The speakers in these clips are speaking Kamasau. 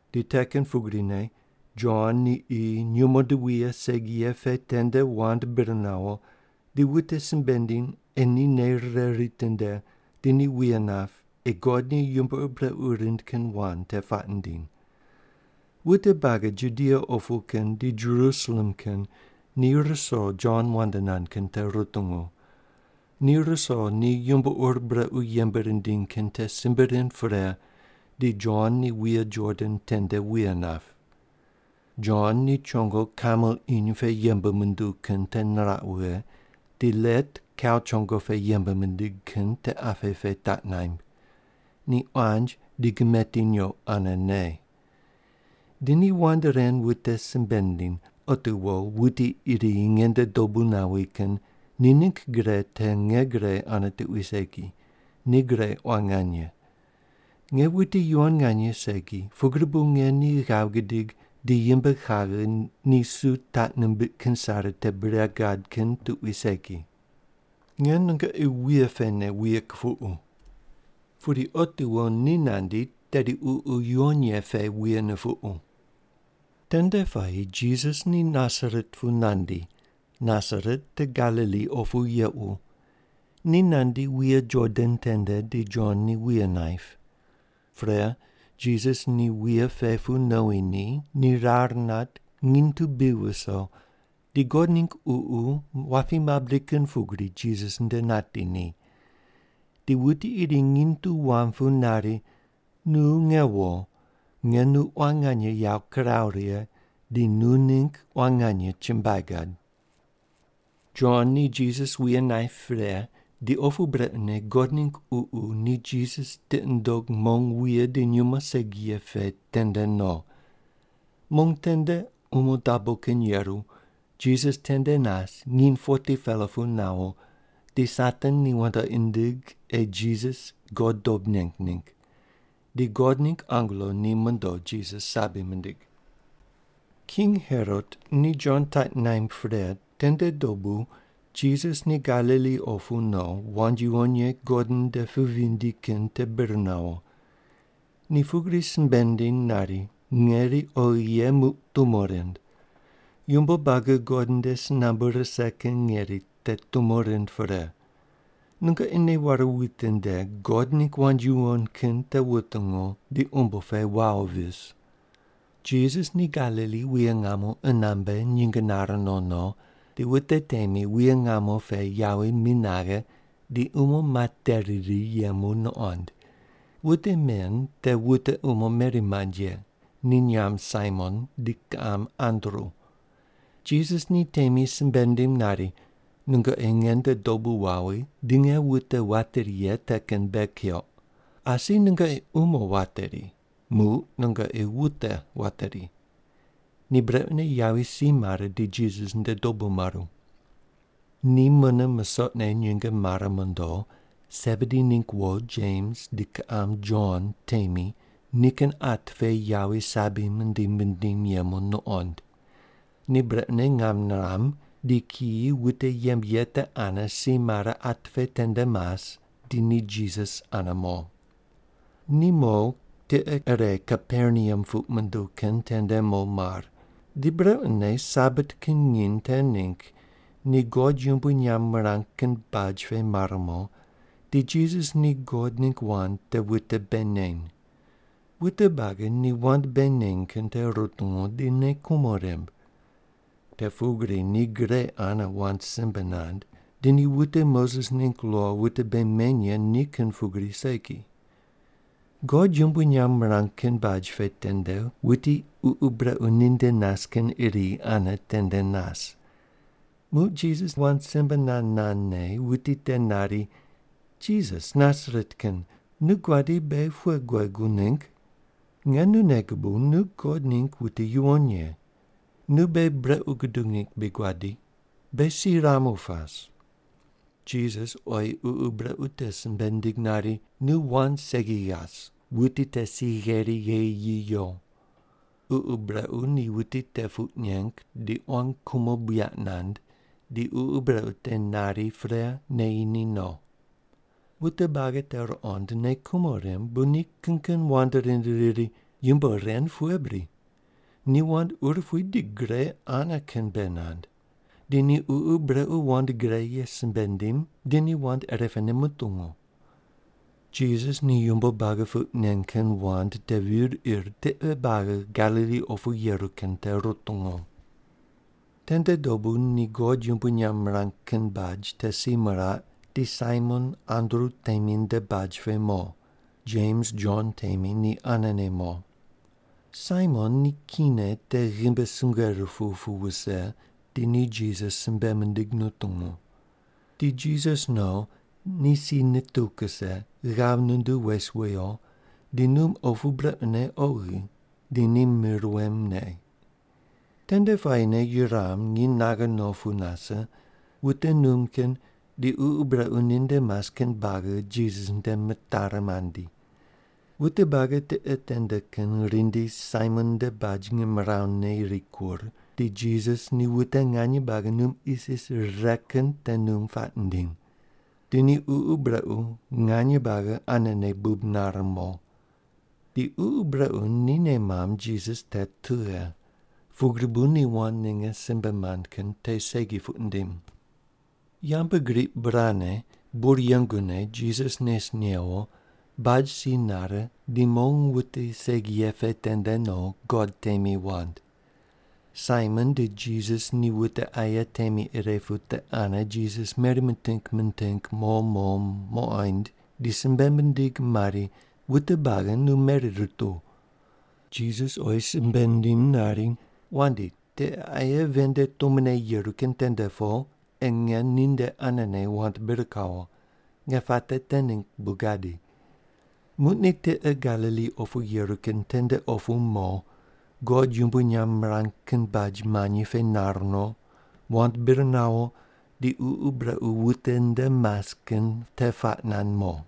Di te kin pugrine Jon ni qi nyumo di wuye segi ye pe tende wand bir nawo di wute simbe nindiny ei ni nei rire ritinde di ni wuye nap ei God ni yumbo ur brequ rind kin wand te puaq nindiny. Wute buagi Judia opu kin di Jerusalem kin ni ruso Jon wand nand kin te rutungu. Ni ruso ni yumbo ur brequ yembe rindiny kin te simbe rind pre di Jon ni wuye Jordan tende wuye nap. Jon ni chongo kamel iny pe yembe munduw kin te niraq wughe, di let kau chongo pe yembe mindig kin te apqe pe taq naimb. Ni quanj di gimeti nyoq ane ne. Di ni wand ren wute simbe nindiny, “Otiwo wuti iri nge nde dobu nawi kin ni ningg gre te nge gre ane tuqui segi, ni gre quan nganye. Nge wuti yuwon nganye segi, pugri bu nge ni ghav gidig di yimb kaghe ni su taq nimbiq kin sare te bure gad kin tuqui segi. Nge nungoqi wuye pene wuye kupuqu. Pudi otiwo ni nandi, tedi Ququ Yuwon Ye pe wuye nupuqu.” Tende puayi Jisas ni Nasaret pu nandi. Nasaret te Galili opu yequ. Ni nandi wuye Jordan tende di Jon ni wuye naip. Pre, Jisas ni wuye pe pu nowi ni ni rar nat, nginy tu bi viso, di God ningg Ququ wapi mabri kin pugri Jisas nde nati ni. Di wuti iri nginy tu wam pu nari, “Nu nge wo. Nge nu quan nganye yawo kiraw righe, di nu ningg quan nganye chumbuai gad.” Jon ni Jisas wuye naip pre, di opu brequne God ningg Ququ ni Jisas tiqi nundog mong wuye di nyumo segi ye pe tende no. Mong tende umo dabo kin yeru, Jisas tende nas nginy 40-pela pu nawo, di Satan ni wandoqi nindig ei Jisas God dob neng ningg. Di God ningg angelo ni mondo Jisas sabi mindig. King Herot ni Jon taq naimb pre tende dobu Jisas ni Galili opu no, wand yuwon ye God nde pu vindi kin te bir nawo. Ni pugri simbe nindiny nari, “Ngeri oghi ye muq tumo rind. Yumbo buagi God nde si nambu rise kin ngeri te tumo rind pre. Nungoqi nei ware witinde, God ningg wand yuwon kin te wutungu di umbo pe wawo vis.” Jisas ni Galili wuye ngamo qunambe nyinge nare no no, di wute temi wuye ngamo pe yawi mi naghe di umo materi ri yemu nuqond. Wute men te wute umo meri mand ye, ni nyamb Saimon di kiqam Andru. Jisas ni temi simbe nindim nari, “Nungoqi nge nde dobu wawi, di nge wute wateri ye te kin bei keuq. Asi nungoqi umo wateri, muq nungoqi wute wateri.” Ni brequne yawi si mare di Jisas nde dobu maru. Ni mune musoqne nyinge mare mondo, Sebedi ningg wo Jems di kiqam Jon temi nikin at pe yawi sabi mindim mindim yemu nuqond. Ni brequne ngam niram, di kiyi wute yembe ye te ane si mare at pe tende mas di ni Jisas ane mo. Ni mo tiqe ire Kaperneam puq munduw kin tende mo mar. Di brequne Sabat kin nginy te ningg ni God yumbui nyamb mirang kin baj pe mar mo, di Jisas ni God ningg wand te wute bei neny. Wute buagi ni wand bei neny kin te rutungu, di nei kumo rimb. Te pugri ni gre ane wand simbe nand, di ni wute Moses ningg lo wute bei meny ye ni kin pugri segi. God yumbui nyamb mirang kin baj pe tende wuti ququ brequ ninde nas kin iri ane tende nas. Muq Jisas wand simbe nand nandne wuti te nari, “Jisas Nasaret kin, nu guadi beghi pughe guegu ningg? Nge nu nei gubuw, nu God ningg wuti yuwon ye. Nu beghi brequ gudug ningg bri guadi? Beghi si ramu pas.” Jisas oyi ququ brequ te simbe nindig nari, “Nu wand segi ghas wuti te si gheri gheyi yi yo.” Ququ brequ ni wuti te puq neng di quan kumo buyaq nand, di ququ brequ te nari pre neyi ni no. Wute buagi te ruqond, nei kumo rimb, bu ni kin kin wand rind riri, “Yumbo ren pughe bri? Ni wand urupui di gre ane kin bei nand. Di ni ququ brequ wand gre ye simbe nindim di ni wand irepene mutungu.” Di Jisas ni yumbo buagi puq nen kin wand te vir ir tiqe buagi Galili opu yeru kin te rutungu. Tende dobu ni God yumbui nyamb mirang kin baj te si miraq, di Saimon Andru temi nde baj pe mo. Jems Jon temi ni anene mo. Saimon ni kine te ghimbi sungue rupuw pu wuse, di ni Jisas simbe mindig nutungu. Di Jisas no, ni si nituw kuse, ghav nunduw wes wuyo di num opu brequne oghi, di ni mir wem me. Tende puayine yuram nginy naghe no pu nase, wute num kin di ququ brequ ninde mas kin buagi Jisas nde mitari mandi. Wute buagi tiqe tende kin rindi Saimon nde baj ngimrawu ne rikur, di Jisas ni wute nganye buagi num isis rire kin te num puaq nindiny. Di ni ququ brequ nganye buagi anene bub nare mo. Di ququ brequ ni nei mamb Jisas te tughe, pugri bu ni wand ninge simbe mand kin te segi puq nindim. Yambgriq burane, bur yengune Jisas nes newo, baj si nare di mong wute segi ye pe tende no, God temi wand. Saimon di Jisas ni wute aye temi ire pu te ane Jisas meri miting miting mo mo muqoind, di simbe mindig mari, “Wute buagi nu meri rutuw.” Jisas oyi simbe nindim nari, “Wandi, tiqe aye ven nde tumone yeru kin tende po, ei nge ninde anene wand bir kawo. Nge puate te ningg bu gadi.” Muq ni tiqe Galili opu yeru kin tende opu mo, God yumbui nyamb mirang kin baj manyi pe nar no, wand bir nawo di ququ brequ wute nde mas kin te puaq nand mo.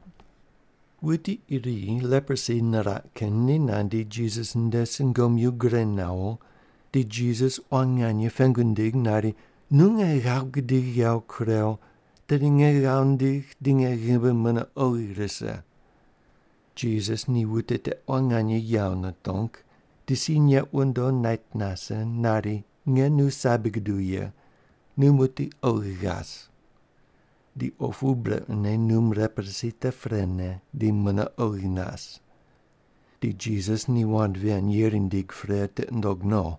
Wuti iri leprosi niraq kin ni nandi Jisas nde sungomyu gure nawo, di Jisas quan nganye pengu nindig nari, “Nu nge ghav gudigh yawo kurew, tedi nge ghav ndigh di nge ghimbi mune oghi rise.” Jisas ni wuti te quan nganye yawo nitong, di si neq wundo, nait nase nari, “Nge nu sabi guduw ye. Nu muqdi oghi ghas!” Di opu brequne num leprosi te prene di mune oghi nas. Di Jisas ni wand ven yeri nindig pre tiqi nundog no.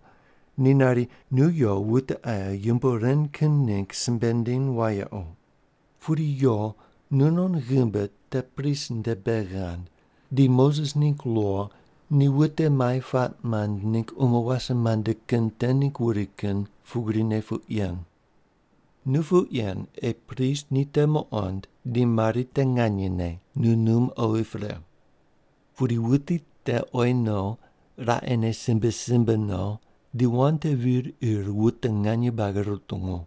Ni nari, “Nu yo wute aye yumbo ren kin ningg simbe ndiny wayequ. Pudi yo nunon ghimbi te prist nde bei ghand, di Moses ningg lo ni wute mai puaq mand ningg umo wase mande kin te ningg wuri kin pugrine puq yen. Nu puq yen ei prist ni te muqond di mari te nganyene nu num oghi pre.” Pudi wuti te oyi no, raqene simbe simbe no, di wand te vir ir wute nganye buagi rutungu.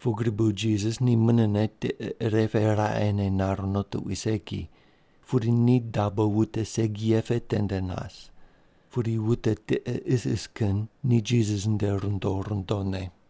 Pugri bu Jisas ni munene tiqe ire pe raqene nar no tuqui segi, pudi ni dabo wute segi ye pe tende nas. Pudi wute tiqe isis kin ni Jisas nde rundo rundone.